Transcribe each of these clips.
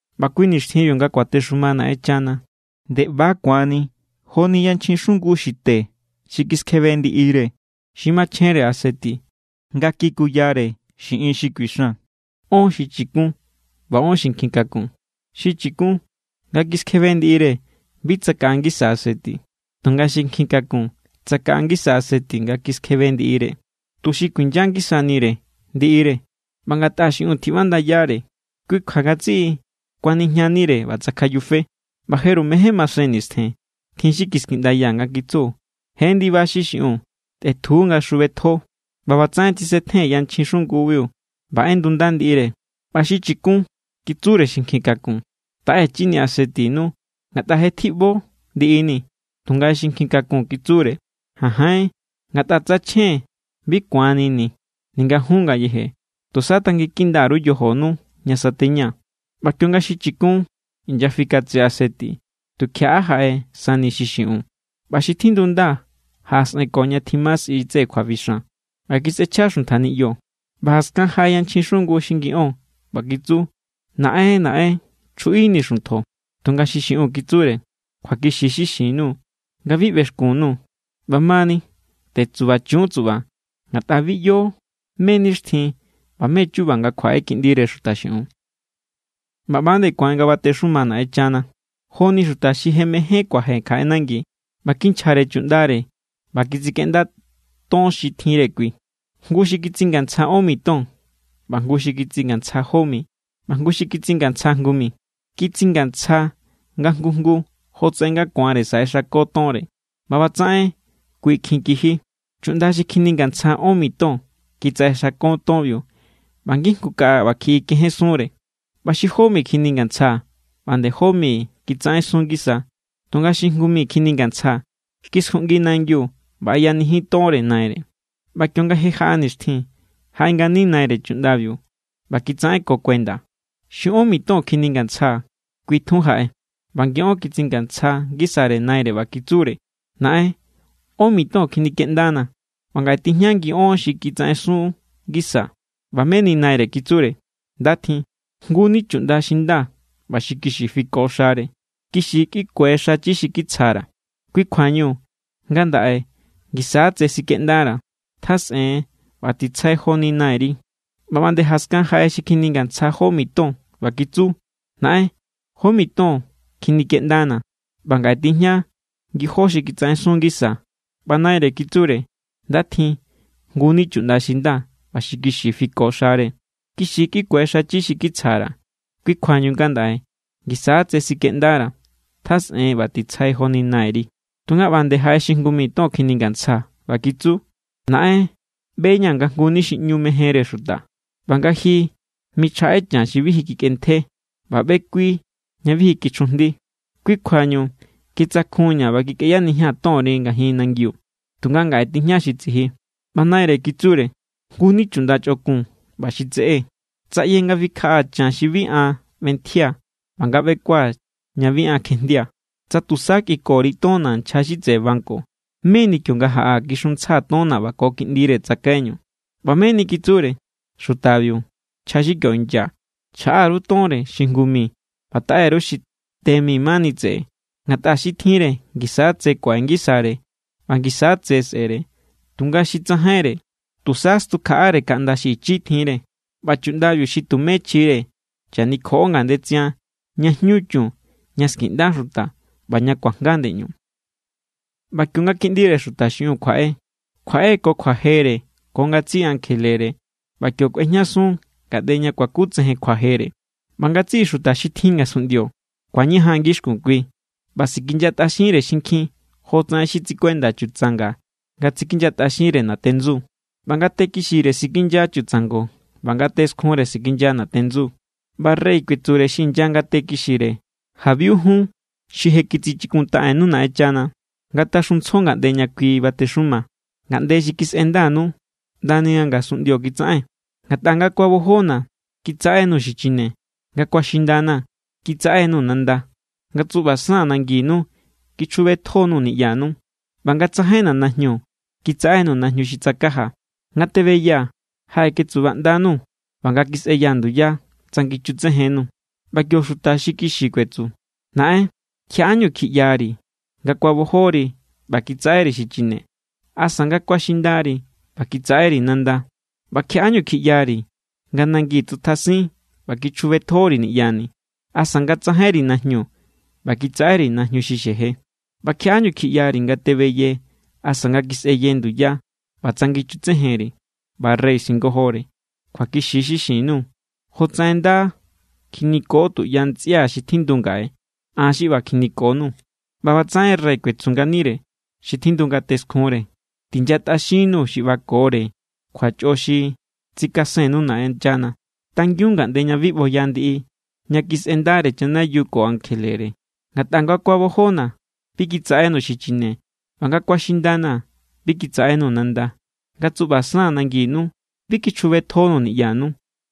’ꞌBa kui nixtjinbiu nga kuatexuma Naꞌenchana nde ꞌba= ku̱anni joni yanchjin xungu xi te xi kiskjebe ndiꞌire xi machjenre aseti nga kikuyare xiꞌin xi kuixan. Ón xi chikun, ꞌba ón xi nkjikakun. Xi chikun nga kiskjebe ndiꞌire, bi tsakaꞌa ngisa aseti. Tunga xi nkjikakun, tsakaꞌa ngisa aseti nga kiskjebe ndiꞌire, tuxi kuinya ngisanire ndiꞌire. ꞌBa ngatꞌa xi xiꞌiun tjiꞌbandayare, kui kjua ngatsiꞌi kuanijñanire ꞌba tsakjayufe. ꞌBa jeru mején masen nistjen, tjin xi kiskiꞌndaya nga kitsu: “¡Je ndiba xi xiꞌiun! ¡Tꞌetju nga xjubetjo!” ꞌBa ꞌbatsaꞌen tsisetjen yanchjin xungubiu ꞌba ꞌendunda ndiꞌire. ꞌBa xi chikun kitsure xi nkjikakun: “Taꞌechinii̱ asetinu, ngatꞌa je tjiꞌbo ndiꞌini̱.” Tunga xi nkjikakun kitsure: “Janjain, ngatꞌa tsa chjen, bi ku̱annini̱ ninga jun ngayeje. Tusa tanginkinda_ru yojonu ña sateña.” ꞌBa kionga xi chikun inyafikatse aseti, tukjiaꞌa jaꞌe sani xi xiꞌiun. ꞌBa xi tjindunda jaꞌasꞌenko ña tjima sꞌi tseꞌe kjuabixan, ꞌba kisꞌechja xuntja niꞌyo. ꞌBa jaskan jaꞌe yanchjin xungu xi ngi ón, ꞌba kitsu: “¡Naꞌen, Naꞌen, chjuꞌinii̱ xuntjo!” Tunga xi xiꞌiun kitsure: “Kjuakixi= xi xin_nuu̱ nga bi ꞌbexkun_nuu̱.” ’ꞌBamani tetsubachun tsuꞌba, ngatꞌa bi ꞌyo mé= nixtjin ꞌba mé= chuba nga kjuaꞌe Kiꞌndire Xuta xiꞌiun. ’ꞌBa ꞌba nde ku̱an nga kuatexuma Naꞌenchana, jo=ni jngu xuta xi je mejen kuaje kjaꞌe nangi, ꞌba kinchjare chuꞌndare ꞌba kitsikeꞌnda ton xi tjinre kui. ’Jngu xi kitsingantsja ón mi ton, ꞌba jngu kitsingantsja jó mi, ꞌba jngu kitsingantsja jngu mi. Kitsingantsja nga jngu jngu jotsaꞌen nga ku̱anre saꞌexako tonre. ꞌBa ꞌbatsaꞌen kui kjin kiji. Chuꞌnda xi kjiningantsja ón mi ton kitsaꞌexako tonbiu ꞌba ngijngu kaꞌa ꞌbakjiꞌi kejensunre. ꞌBa xi jó mi kjiningantsja ꞌba nde jó mi kitsaꞌensun ngisa. Tunga xi jngu mi kjiningantsja kiskjuꞌngi nangiu ꞌba ꞌeyanijin tonre naire. ’ꞌBa kionga je jaꞌa nkjin nixtjin, jaꞌe ngani naire chuꞌndabiu ꞌba kitsaꞌenko kuenda. Xi ón mi ton kjiningantsja kui tjun jaꞌe, ꞌba ngi ón kitsjasun ngisare naire ꞌba kitsure: “Naꞌen, ón mi ton kjinikeꞌndanaa̱, ꞌba ngaꞌe tijña ngiꞌón xi kitsaꞌensun ngisaa̱.” ꞌBa meni naire kitsure: “Nda tjin, jngu=ni chuꞌnda xi nda ꞌba xi kixi fiko xare. Kixi= kꞌiku̱e xachi xi kitsjare, kui kjuañu ngandaꞌe ngisa= tse sikeꞌndara̱. Tjasꞌen ꞌba titsjai joni nairi.” ꞌBa ꞌba nde jaskan jaꞌe xi kjiningantsja jó mi ton ꞌba kitsu: “Naꞌen, jó mi ton kjinikeꞌndanaa̱, ꞌba ngaꞌe tijña ngijó xi kitsaꞌensun ngisaa̱.” ꞌBa naire kitsure: “Nda tjin, jnguni chuꞌnda xi nda ꞌba xi kixi fiko xare. Kixi= kꞌiku̱e xachi xi kitsjare, kui kjuañu ngandaꞌe ngisa= tse sikeꞌndara̱. Tjasꞌen ꞌba titsjai joni nairi.” Tunga ꞌba nde jaꞌe xi jngu mi ton kjiningantsja ꞌba kitsu: “Naꞌen, ꞌbeña̱ nga jnguni xi ꞌñu mejenre xuta, ꞌba nga ji michjaꞌe chan xi bi ji kikꞌentje ꞌba ꞌbekui ña bi ji kichjujndi. Kui kjuañu kitsakjunña̱ ꞌba kikꞌeyanijia̱n tonri ngajin nangiu. Tunga ngaꞌe tijña xi tsiji.” ꞌBa naire kitsure: “Jngu= ni chuꞌnda chꞌokun ꞌba xi tseꞌé. Tsa ꞌye nga fikjaꞌaa̱ chan xi bi an ꞌbentjia̱ ꞌba nga ꞌbekua̱ ña bi an kjejndia̱, tsa tusa kꞌikori tonna̱ nchja xi tseꞌe banco. Meni kionga jaꞌaa̱, kixuntsjaa̱ tonna̱ ꞌba ko kiꞌndire tsakaiñu.” ꞌBa meni kitsure xutabiu nchja xi kio inya: “Chjaꞌá_ru tonre xi jngu mi, ꞌba taꞌe_ru xi te mi mani tseꞌe. Ngatꞌa xi tjinre ngisa= tse kuaꞌe ngisare ꞌba ngisa tse sꞌe̱re. Tunga xi tsajainre, tusa stjukjaꞌare kaꞌnda xi ichi tjinre. ꞌBa chuꞌndabi xi tumé chjire, chanikjoꞌo ngandetsian ña jñu chun, ña skiꞌnda xuta ꞌba ña kuajnga ndeꞌñu.” ’ꞌBa kionga Kiꞌndire Xuta xiꞌiun kjuaꞌe, kjuaꞌe ko kjuajere ko ngatsiꞌi ankjelere ꞌba kio kꞌuejñasun ngaꞌnde ña kuakutsejen kjuajere. ꞌBa ngatsiꞌi xuta xi tjin ngasunꞌndio ku̱añajan ngixkun kui, ꞌba sikinyatꞌaxinre xinkjin jotsaꞌen xi tsikuenda chutsanga nga tsikinyatꞌaxinre natendsu. ꞌBa ngate kixire sikinya chutsango ꞌba ngate skjunre sikinya natendsu. ꞌBa rey kuetsure xi inya ngate kixire: “Jabiu jun, xi je kitsichikuntaꞌennu Naꞌenchana. Ngataxuntsjo ngaꞌnde ña kui batexuma, ngaꞌnde xi kisꞌendanu ꞌndani nga ngasunꞌndio kitsaꞌen. Ngatꞌa nga kuabojona̱, kitsaꞌenuu̱ xi chine. Nga kuaxindana̱, kitsaꞌenuu̱ nanda. Nga tsuꞌbasaa̱n nanginu, kichjubetjonuu̱ niꞌyanu. ꞌBa nga tsajainna̱ najñu, kitsaꞌenuu̱ najñu xi tsakajaa̱. Nga tebeyaa̱, jaꞌeketsubaꞌndanuu̱. ꞌBa nga kisꞌeyaa̱ nduya, tsangichutsejennuu̱.” ꞌBa kio xuta kixi kuetsu: “Naꞌen, ¿kjiaꞌáñu kjiꞌyari̱ nga kuabojori ꞌba kitsaꞌeri̱ xi chine, asa nga kuaxindari ꞌba kitsaꞌeri̱ nanda? ꞌBa ¿kjiaꞌáñu kjiꞌyari̱ nga nangin tsutjasin ꞌba kichjubetjori̱ niꞌyani̱, asa nga tsajainri najñu ꞌba kitsaꞌeri̱ najñu xi xeje? ꞌBa ¿kjiaꞌáñu kjiꞌyari̱ nga tebeye asa nga kisꞌeye nduya ꞌba tsangichutsejenri̱?” ꞌBa rey singojore: “Kjuakixi= xi xin_nuu̱. Jotsaꞌen nda kjiniko tuꞌya ntsꞌia̱ xi tjindu ngaꞌe, an xi ꞌba kjinikonuu̱.” ’ꞌBa ꞌbatsaꞌen rey kuetsu nganire xi tjindu ngate skjunre: “Tinyatꞌaxinnuu̱, xi ꞌbakore kjuachꞌo xi tsikasennu Naꞌenchana. Tangiun ngaꞌnde ña bi ꞌboya ndiꞌi ña kisꞌendare chanayiu ko ankjelere. Ngatꞌa nga kuabojona̱, bi kitsaꞌenuu̱ xi chine. ꞌBa nga kuaxindana̱, bi kitsaꞌenuu̱ nanda. Nga tsuꞌbasaa̱n nanginu, bi kichjubetjonuu̱ niꞌyanu.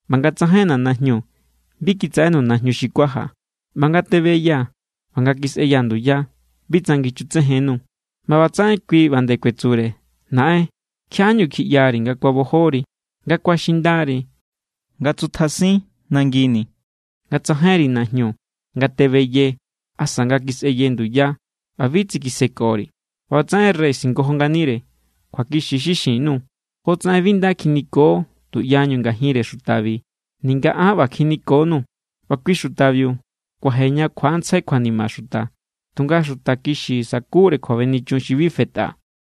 ꞌBa nga tsajainna̱ najñu, bi kitsaꞌenuu̱ najñu xi kuajaa̱. ꞌBa nga tebeyaa̱ ꞌba nga kisꞌeyaa̱ nduya, bi tsangichutsejennuu̱.” ꞌBa ꞌbatsaꞌen kui ꞌba nde kuetsure: “Naꞌen, ¿kjiaꞌáñu kjiꞌyari̱ nga kuabojori, nga kuaxindari, nga tsutjasin nangini̱, nga tsajainri najñu, nga tebeye, asa nga kisꞌeye nduya, ꞌba bi tsikisekori̱?” ꞌBa ꞌbatsaꞌen rey singojo nganire: “Kjuakixi= xi xin_nuu̱. Jotsaꞌen bi nda kjiniko tuꞌyañu ngajinre xutabi, ninga aán ꞌba kjinikonuu̱.” ꞌBa kui xutabiu kuaje ña kjuaꞌantsjai kjuanima xuta, tunga xuta kixi sakure kjuabenichun xi bi fetꞌa.